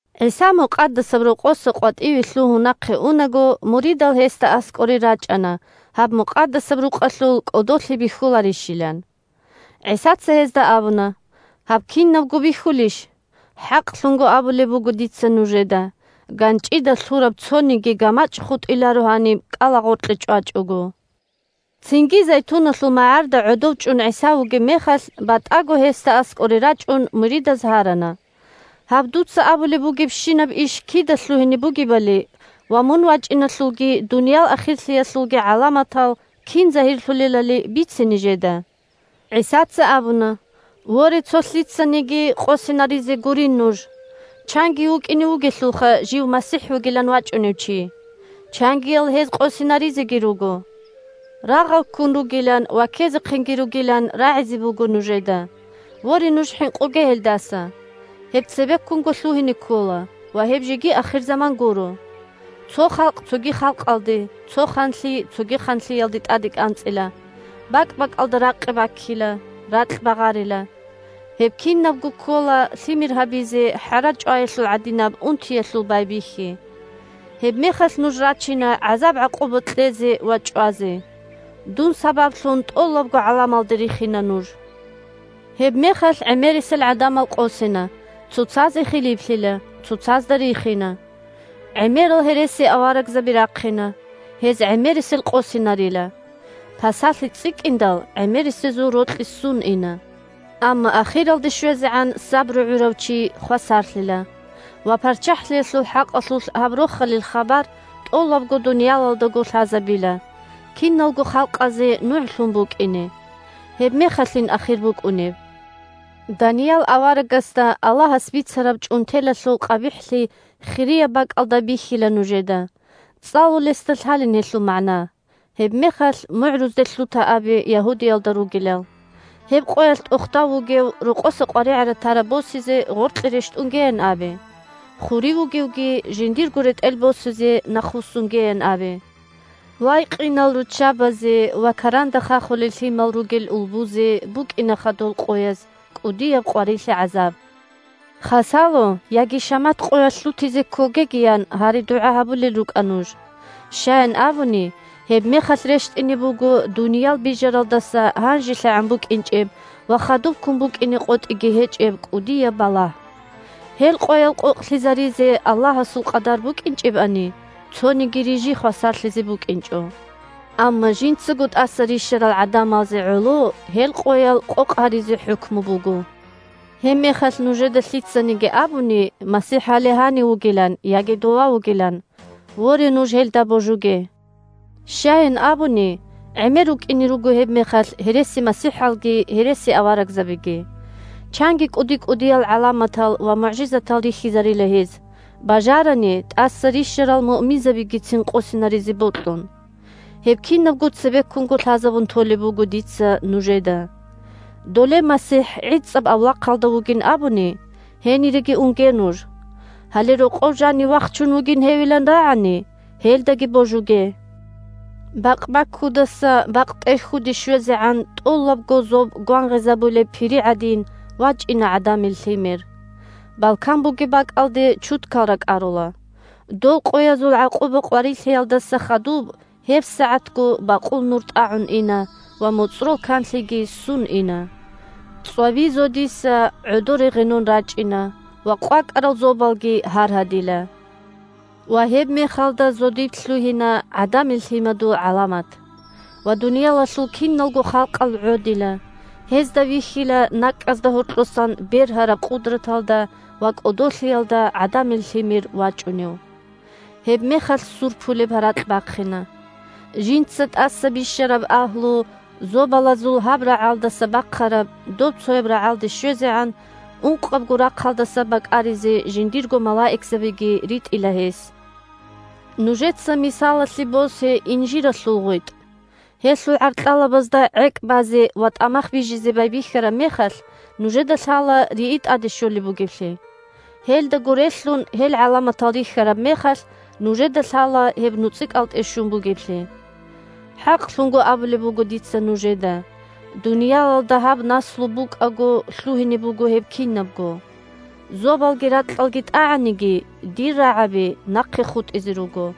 ГӀиса Мукъадасаб Рокъоса къватӀиве лъугьун нахъе унаго, муридал гьесда аскӀоре рачӀана гьаб Мукъадасаб Рукъалъул кӀодолъи бихьуларищилан. ГӀисаца гьезда абуна: – Гьаб кинабго бихьулищ? ХӀакълъун абулеб буго дица нужеда: ганчӀида лъураб цониги гамачӀ хутӀиларо гьаниб кӀалагъоркье чӀвачӀого. Цинги Зайтуналъул магӀарда гӀодов чӀун ГӀиса вугеб мехалъ, батӀаго гьесда аскӀоре рачӀун, муридаз гьарана: – Гьаб дуца абулеб бугебщинаб иш кида лъугьине бугебали ва мун вачӀиналъулги дуниял ахирлъиялъулги гӀаламатал кин загьирлъулелали бице нижеда. ГӀисаца абуна: – Воре, цо лъицаниги къосинаризе гурин нуж! Чанги вукӀине вугелъулха жив МасихӀ вугилан вачӀунев чи. Чангиял гьез къосинаризеги руго. Рагъал ккун ругилан ва ккезехъинги ругилан рагӀизе буго нужеда. Воре, нуж хӀинкъуге гьелдаса. Гьеб цебеккунго лъугьине ккола, ва гьеб жеги ахирзаман гуро. Цо халкъ цоги халкъалде, цо ханлъи цоги ханлъиялде тӀаде кӀанцӀила. БакӀ-бакӀалда ракъи баккила, ракь багъарила. Гьеб кинабго ккола лъимер гьабизе хӀара чӀваялъул гӀадинаб унтиялъул байбихьи. Гьебмехалъ нуж рачина гӀазаб-гӀакъуба кьезе ва чӀвазе. Дун сабаблъун тӀолабго гӀаламалда рихина нуж. Гьебмехалъ гӀемерисел гӀадамал къосина, цоцазе хилиплъила, цоцазда рихина. ГӀемерал гьересиаварагзаби рахъина, гьез гӀемерисел къосинарила. Пасалъи цӀикӀкӀиндал, гӀемерисезул рокьи ссун ина. Амма ахиралде щвезегӀан сабру гӀурав чи хвасарлъила. Ва ПарччахӀлъиялъул хӀакъалъулъ гьаб Рохалил хабар тӀолабго дуниялалдаго лъазабила, киналго халкъазе нугӀлъун букӀине. Гьебмехалъин ахир букӀунеб. Даниял аварагасда Аллагьас бицараб чӀунтелалъул къабихӀлъи хирияб бакӀалда бихьила нужеда, – цӀалулесда лъалин гьелъул магӀна – гьебмехалъ мугӀрузде лъута абе Ягьудиялда ругелал. Гьеб къоялъ тӀохда вугев, рокъоса къваригӀараб-тараб босизе, гъоркье рещтӀунгеян абе. Хурив вугевги жиндирго ретӀел босизе нахъвуссунгеян абе. Вай, къинал руччабазе ва каранда хахулел лъимал ругел улбузе букӀинаха дол къояз кӀудияб къварилъи-гӀазаб! Хасало яги шамат къоялъ лъутизе ккогегиян гьари-дугӀа гьабулел рукӀа нуж. Щаян абуни, гьебмехалъ рещтӀине буго дуниял бижаралдаса гьанжелъагӀан букӀинчӀеб ва хадубккун букӀине къотӀиги гьечӀеб кӀудияб балагь. Гьел къоял къокълъизаризе Аллагьасул къадар букӀинчӀебани, цониги рижи хвасарлъизе букӀинчӀо. Амма жинцаго тӀаса рищарал гӀадамазе гӀоло гьел къоял къокъ гьаризе хӀукму буго. Гьебмехалъ нужеда лъицаниги абуни, МасихӀ гьале гьанив вугилан, яги дова вугилан, воре, нуж гьелда божуге. Щаян абуни, гӀемер рукӀине руго гьебмехалъ гьересимасихӀалги гьересиаварагзабиги. Чанги кӀуди-кӀудиял гӀаламатал ва мугӀжизатал рихьизарила гьез, бажарани, тӀаса рищарал муъминзабигицин къосинаризе бокьун. Гьеб кинабго цебеккунго лъазабун толеб буго дица нужеда! Доле МасихӀ гӀицӀаб авлахъалда вугин абуни, гьениреги унге нуж, гьале рокъов жанив вахчун вугин гьевилан рагӀани, гьелдаги божуге. Бакъбаккудаса бакътӀерхьуде щвезегӀан тӀолабго зоб гвангъизабулеб пири гӀадин вачӀина ГӀадамил Лъимер. Балкан бугеб бакӀалде чудкал ракӀарула. Дол къоязул гӀакъуба-къварилъиялдаса хадуб гьебсагӀатго бакъул нур тӀагӀун ина, ва моцӀрол канлъиги ссун ина. ЦӀваби зодиса гӀодоре гъенон рачӀина, ва къвакӀарал зобалги гьаргьадила. Ва гьебмехалда зодиб лъугьина ГӀадамил Лъимадул гӀаламат. Ва дуниялалъул киналго халкъал гӀодила, гьезда вихьила накӀкӀазда гьоркьосан бергьараб къудраталда ва кӀодолъиялда ГӀадамил Лъимер вачӀунев. Гьебмехалъ ссур пулеб гьаракь бахъина. Жинца тӀаса бищараб агьлу зобалазул гьаб рагӀалдаса бахъараб добцояб рагӀалде щвезегӀан – ункъабго рахъалдаса бакӀаризе жиндирго малаикзабиги ритӀила гьес. Нужеца мисалалъе босе инжиралъул гъветӀ. Гьелъул гӀаркьалабазда гӀекӀ базе ва тӀамах бижизе байбихьараб мехалъ, нужеда лъала рии тӀаде щолеб бугеблъи. Гьелдаго релълъун, гьел гӀаламатал рихьараб мехалъ, нужеда лъала гьеб нуцӀикӀалтӀе щун бугеблъи. ХӀакълъун абулеб буго дица нужеда: дуниялалда гьаб наслу букӀаго лъугьине буго гьеб кинабго. Зобалги ракьалги тӀагӀаниги, дир рагӀаби нахъе хутӀизе руго.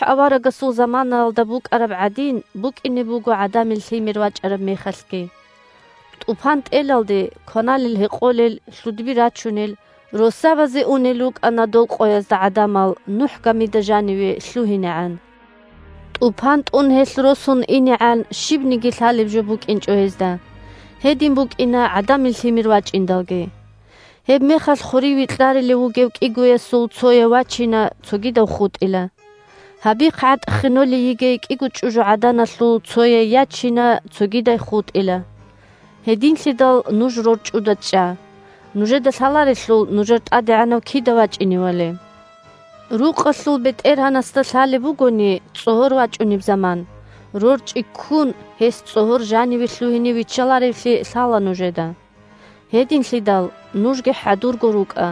НухӀ аварагасул заманаялда букӀараб гӀадин букӀине буго ГӀадамил Лъимер вачӀараб мехалъги. ТӀупан тӀелалде, кваналел-гьекъолел, лъудби рачунел, россабазе унел рукӀана дол къоязда гӀадамал, НухӀ гамида жаниве лъугьинегӀан. ТӀупан тӀун, гьелъ росун инегӀан, щибниги лъалеб жо букӀинчӀо гьезда. Гьедин букӀина ГӀадамил Лъимер вачӀиндалги. Гьебмехалъ хурив векьарилев вугев кӀигоясул цояв вачина, цогидав хутӀила. Гьабихъ гӀатӀ ххенолей йигей кӀиго чӀужугӀаданалъул цояй ячина, цогидай хутӀила. Гьединлъидал нуж рорчӀуда чӀа, нужеда лъаларелъул нужер ТӀадегӀанав кида вачӀиневали. Рукъалъул бетӀергьанасда лъалеб бугони цӀогьор вачӀунеб заман, рорчӀи ккун, гьес цӀогьор жаниве лъугьине виччаларевлъи лъала нужеда. Гьединлъидал нужги хӀадурго рукӀа,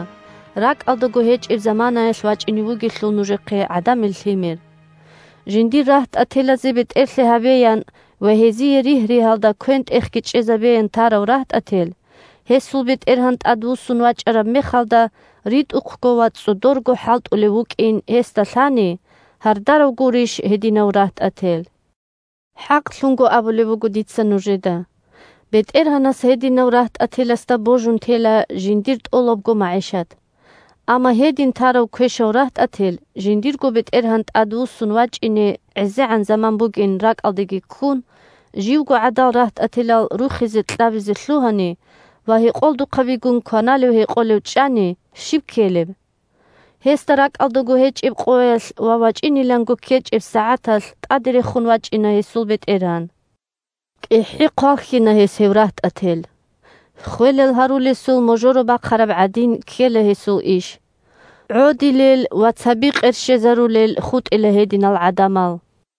ракӀалдаго гьечӀеб заманаялъ вачӀине вугелъул нужехъе ГӀадамил Лъимер. Жиндир рагьтӀателазе бетӀерлъи гьабеян ва гьезие ригь-ригьалда квен-тӀехги чӀезабеян тарав рагьтӀател, гьесул бетӀергьан тӀадвуссун вачӀараб мехалда ритӀухъго ва цӀодорго хӀалтӀулев вукӀин гьесда лъани, – гьардарав гурищ гьединав рагьтӀател. ХӀакълъун абулеб буго дица нужеда: бетӀергьанас гьединав рагьтӀателасда божун тела жиндир тӀолабго магӀишат. Амма гьедин тарав квешав рагьтӀател, жиндирго бетӀергьан тӀадвуссун вачӀине гӀезегӀан заман бугин ракӀалдеги ккун, живго гӀадал рагьтӀателал рухизе-кьабизе лъугьани ва гьекъолдухъабигун кваналев-гьекъолев чӀани, щиб ккелеб? Гьесда ракӀалдаго гьечӀеб къоялъ ва вачӀиниланго ккечӀеб сагӀаталъ тӀаде рехун вачӀина гьесул бетӀергьан. КӀихӀи хъвалхьина гьес гьев рагьтӀател. Ххвелал гьарулесул можоро бахъараб гӀадин ккела гьесул иш. ГӀодилел ва цаби къерщезарулел хутӀила гьединал гӀадамал.